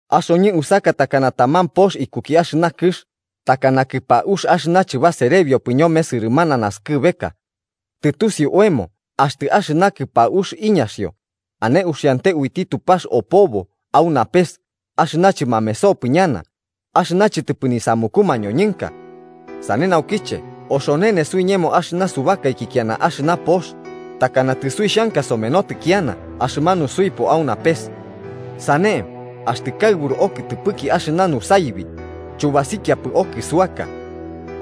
Axoñɨ usaka takana taman pox ikuki axɨna kɨx, takana kɨpaux axɨna chɨbaserebiopɨ ñome sɨrɨmana naskɨbeka. Tɨtusiu oemo axtɨ axɨna kɨpaux iñaxio, ane uxiante uiti Tupax opobo au napes axɨna chɨmamesopɨ ñana, axɨna chɨtɨpɨ nisamuku mañoñɨnka. Sane naukiche oxonene suiñemo axɨna subakaiki kiana axɨna pox, takana tɨsuixhanka somenotɨ kiana axɨmanu suipo au napes. Sane, axtɨ kaɨburu okɨtɨpɨki axɨna nusaibi, chubasikiapɨ okɨsuasaka.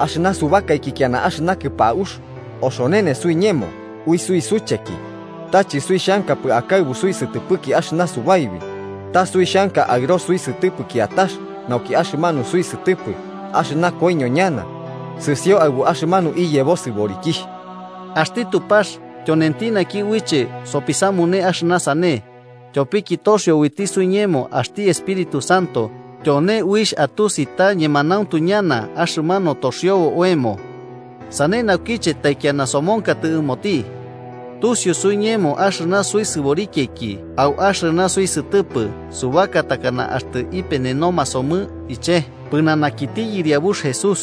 Axɨna subakaiki kiana axɨna kɨpaux oxonene suiñemo ui suisucheki, ta chɨsuixhankapɨ akaɨbu suisɨtɨpɨki axɨna subaibi, ta suixhanka aɨro suisɨtɨpɨ kiatax nauki axɨmanu suisɨtɨpɨ axɨna koiño ñana sɨsio aɨbu axɨmanu iyebo sɨborikixh. Axti Tupax tyonenti naki uiche sopisamune axɨna sane, tyopiki toxio uiti suiñemo axti Espíritu Santo tyone uixh atusi ta ñemanauntu ñana axɨmanu toxiobo oemo. Sane naukiche taikiana somonkatɨ ɨmoti. Tusiu suiñemo axɨna suisɨborikiaiki au axɨna suisɨtɨpɨ subaka takana axtɨ ipenenoma somɨ iche pɨnanakiti Yɨriabux Jesús.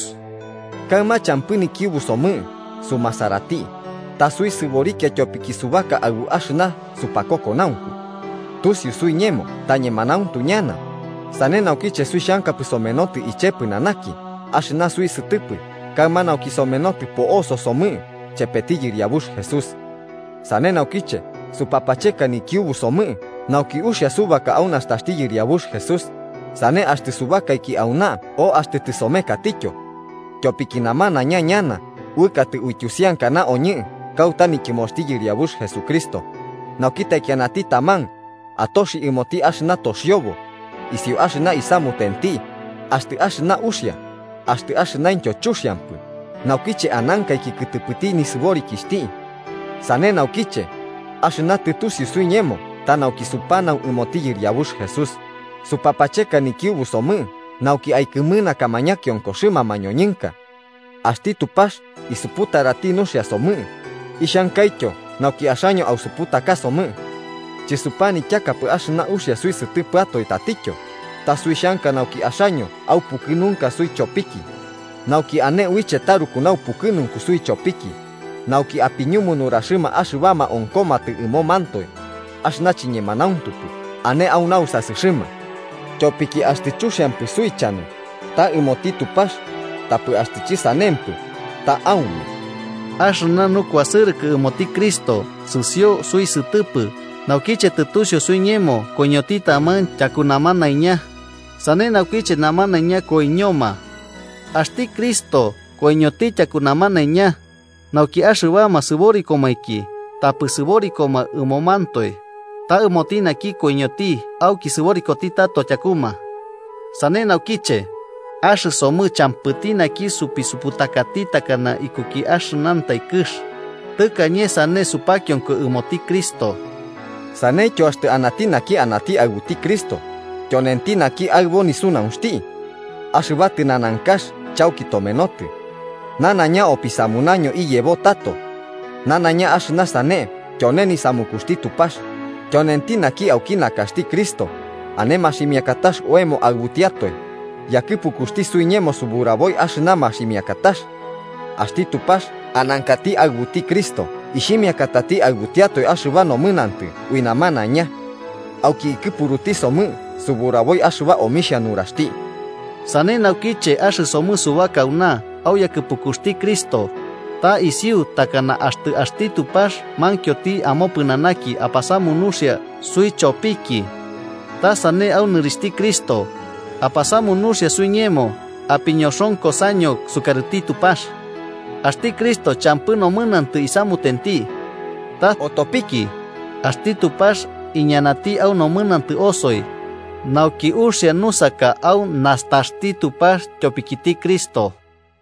Kaɨma champɨ nikiubu somɨ sumasarati, ta suisɨborikia tyopiki subaka aɨbu axɨna supakokonaunku. Tusiu suiñemo ta ñemanauntu ñana, sane naukiche suixhankapɨ somenotɨ iche pɨnanaki axɨna suisɨtɨpɨ kaɨma nauki somenotɨ po'oso somɨ chepeti Yɨriabux Jesús. Sane naukiche supapacheka nikiubu somɨ nauki uxia subaka au nastaxti Yɨriabux Jesús, sane axtɨ subakaiki auna o axtɨ tɨsomekatityo. Tyopiki namanaiña ñana uɨkatɨ uityusiankana oñɨ kauta nityɨmoxti Yɨriabux Jesucristo, nauki taikianati taman atoxi ɨmoti axɨna toxiobo, isiu axɨna isamutenti axtɨ axɨna uxia axtɨ axɨnaintyo chuxiampɨ naukiche anankaiki kɨtɨpɨti nisɨborikixhti. Sane naukiche, axɨna tɨtusiu suiñemo ta nauki supanau ɨmoti Yɨriabux Jesús, supapacheka nikiubusomɨ nauki aikɨmɨnakama ñakiokoxɨma mañoñɨnka. Axti Tupax isuputarati nuxia somɨ, ixhankaityo nauki axaño ausuputakasomɨ. Chɨsupanityakapɨ axɨna uxia suisɨtɨpɨatoe tatityo, ta suixhanka nauki axaño aupukɨnunka suichopiki, nauki ane uiche tarruku naupukɨnunku suichopiki nauki apiñumu nuraxɨma axɨbama onkomatɨ ɨmomantoe axɨna chiñemanauntupɨ ane au nausasɨxɨma. Tyopiki axtɨ chuxiampɨ suichanu, ta ɨmoti Tupax, tapɨ axtɨ chɨsanempɨ, ta aume. Axɨna nukuasɨrɨkɨ ɨmoti Cristo sɨsio suisɨtɨpɨ naukiche tɨtusiu suiñemo koiñoti taman tyaku namanaiña, sane naukiche namanaiña koiñoma. Axti Cristo koiñoti tyaku namanaiña, nauki axɨbama sɨborikomainki tapɨ sɨborikoma ɨmomantoe, ta ɨmoti naki koiñoti auki sɨborikoti tato tyakuma. Sane naukiche, axɨsomɨ champɨti naki sopisuputakati takana ikuki axɨnantai kɨx, tɨkañe sane supakionko ɨmoti Cristo. Saneityo axtɨ anati naki anati aɨbuti Cristo tyonenti naki aɨbo nisunaunxti. Axɨba tɨnanankax chauki tomenotɨ. Nanaiña opisamunaño iyebo tato. Nanaiña axɨna sane tyone nisamukuxti Tupax, tyonenti naki auki nakaxti Cristo ane maximiakatax oemo aɨbutiatoe, yakɨpukuxti suiñemo suburaboi axɨna maximiakatax. Axti Tupax anankati aɨbuti Cristo ixhimiakatati aɨbutiatoe axɨba nomɨnantɨ ui namanaiña. Auki ikɨpuruti somɨ suburaboi axɨba omixhia nuraxti. Sane naukiche, axɨsomɨ subaka auna au yakɨpukuxti Cristo, ta isiu takana axtɨ axti Tupax mankioti amopɨnanaki apasamu nuxia suichopiki. Ta sane au nɨrixhti Cristo, apasamu nuxia suiñemo apiñoxonkosaño sukarɨti Tupax. Axti Cristo champɨ nomɨnantɨ isamutenti. Ta otopiki, axti Tupax iñanati au nomɨnantɨ osoi, nauki uxia nusaka au nastaxti Tupax tyopikiti Cristo.